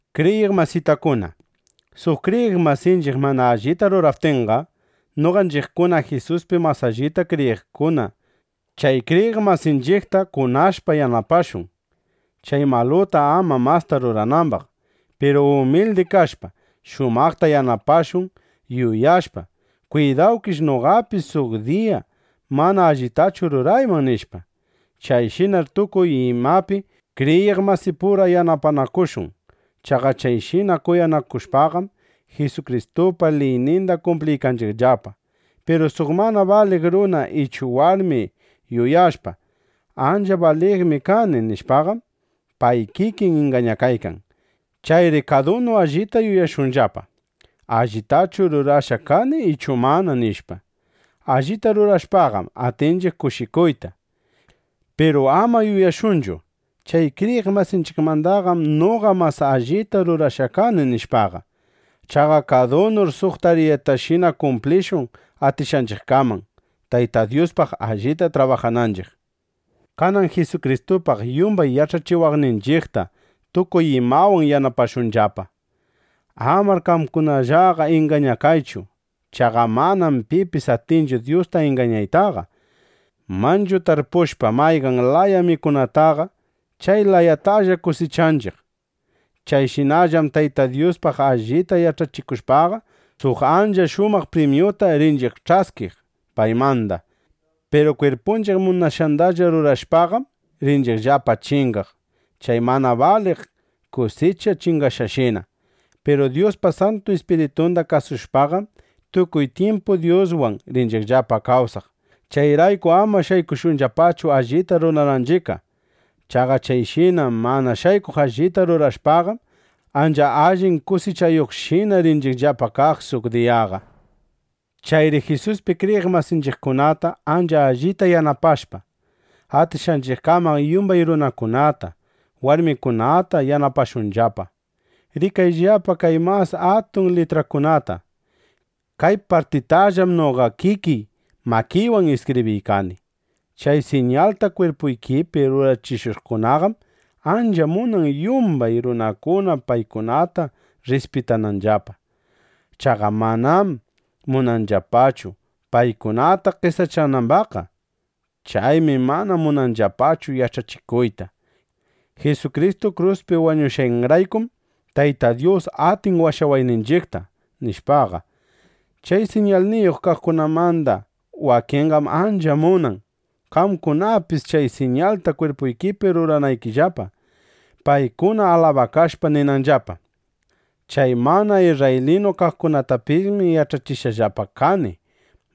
Kriyiq masitakuna, suq kriyiq masinchiq mana allita ruraptinqa, noqanchiqkuna Jisuspi mas allita kriyiqkuna chay kriyiq masinchiqta kunashpa yanapashun, chay maluta ama masta ruranambaq. Piru umildi kashpa, shumaqta yanapashun, yuyashpa: Kwidawkish noqapis suq diya mana allitachu rurayman, nishpa. Chayshinar tukuy imapi kriyiq masipura yanapanakushun. Chaqa chayshina kuyanakushpaqam, Jisukristupa liyninda kumpliykanchiqllapa. Piru suq mana baliq runa ichu warmi yuyashpa: Ancha baliqmi kani, nishpaqam, pay kikin ingañakaykan. Chayri kadunu allita yuyashunllapa: ¿Allitachu rurashqa kani ichu mana? nishpa. Allita rurashpaqam, atinchiq kushikuyta. Piru ama yuyashunchu: Chay kriyiq masinchiqmandaqam noqa mas allita rurashqa kani, nishpaqa. Chaqa kadunur suq tariyatashina kumplishun atishqanchiqkaman, Tayta Dyuspaq allita trabajananchiq. Kanan Jisukristupaq yumbay yach'achiwaqninchiqta tukuy imawan yanapashunllapa. Amar qamkunallaqa ingañakaychu. Chaqa manam pipis atinchu Dyusta ingañaytaqa. Manchu tarpushpa mayqan laya mikunataqa, chay layatalla kusichanchiq. (Chayshinallam Tayta Dyuspaq allita yach'achikushpaqa, suq ancha shumaq primyuta rinchiq ch'askiq paymanda.) Piru kwirpunchiq munashqandalla rurashpaqam, rinchiqllapa chingaq, chay mana baliq kusicha chingaqshina. Piru Dyuspa Santu Ispiritunda kasushpaqam, tukuy tyimpu Dyuswan rinchiqllapa kawsaq. Chayrayku ama shaykushunllapachu allita rurananchiqqa. Chaqa chayshina mana shaykuq allita rurashpaqam, ancha allin kusichayuqshina rinchiqllapa kaq suq diyaqa. Chayri Jisuspi kriyiq masinchiqkunata ancha allita yanapashpa, atishqanchiqkaman yumbay runakunata, warmikunata yanapashunllapa. Rikayllapa kay mas atun litrakunata. Kay partitallam noqa kikiy makiywan iskibriykani. Chay siñalta kwirpuykipi rurachishuqkunaqam ancha munan, yumbay runakuna paykunata rrispitananllapa. Chaqa manam munanllapachu, paykunata qesachanambaqqa. Chaymi mana munanllapachu yach'achikuyta: “Jisukristu kruspi wañushqanraykum, Tayta Dyus atin washawayninchiqta”, nishpaqa. Chay siñalniyuq kaqkunamanda wakinqam ancha munan, qamkunapis chay siñalta kwirpuykipi ruranaykillapa, paykuna alabakashpa ninanllapa: “Chay mana isrraylinu kaqkunatapismi yach'achishqallapa kani,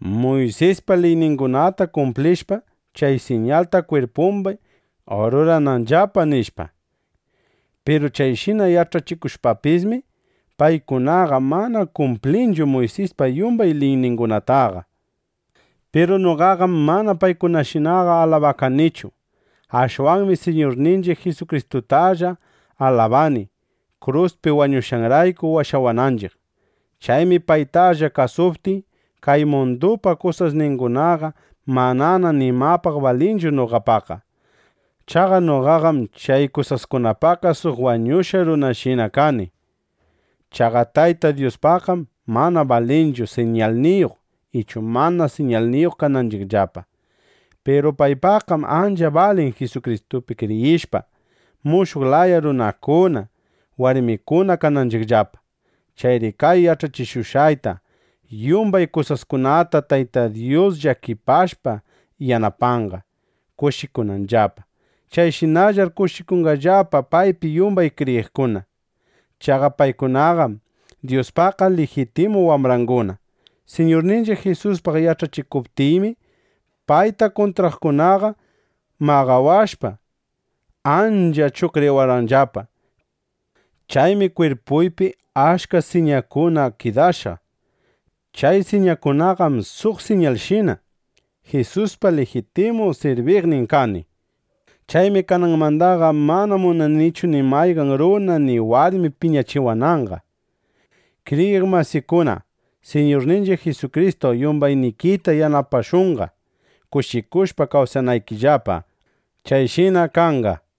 Muysispa liyningunata kumplishpa, chay siñalta kwirpumbi rurananllapa”, nishpa. Piru chayshina yach'achikushpapismi, paykunaqa mana kumplinchu Muysispa yumbay liyningunataqa. Piru noqaqam mana paykunashinaqa alabakanichu. Ashwanmi Siñurninchiq Jisukristutalla alabani, kruspi wañushqanrayku washawananchiq. Chaymi paytalla kasuptiy, kay mundupa kusasningunaqa manana nimapaq balinchu noqapaqqa. Chaqa noqaqam chay kusaskunapaqqa suq wañushqa runashinana kani. Chaqa Tayta Dyuspaqqam mana balinchu, siñalniyuq ichu mana siñalniyuq kananchiqllapa. Piru paypaqqam ancha balin Jisukristupi kriyishpa, mushuq laya runakuna, warmikuna kananchiqllapa. Chayri kay yach'achikushqayta yumbay kasuqkunata Tayta Dyus llakipashpa yanapanqa, kushikunanllapa. Chayshinallar kushikunqallapa paypi yumbay kriyiqkuna. Chaqa paykunaqam Dyuspaqqa lijitimu wambrangunana. Siñurninchiq Jisuspaq yach'achikuptiymi, payta kuntraqkunaqa maqawashpa, ancha chuqriwashqallapa. Chaymi kwirpuypi achka siñakuna kidashqa. Chay siñakunaqam suq siñalshina, Jisuspa lijitimu sirbikuqnin kani, nishpa. Chaymi kananmandaqa mana munanichu ni mayqan runa ni warmi piñachiwananqa. Kriyiq masikuna, Siñurninchiq Jisukristu yumbaynikita yanapashunqa, kushikushpa kawsanaykillapa. Chayshina kanqa.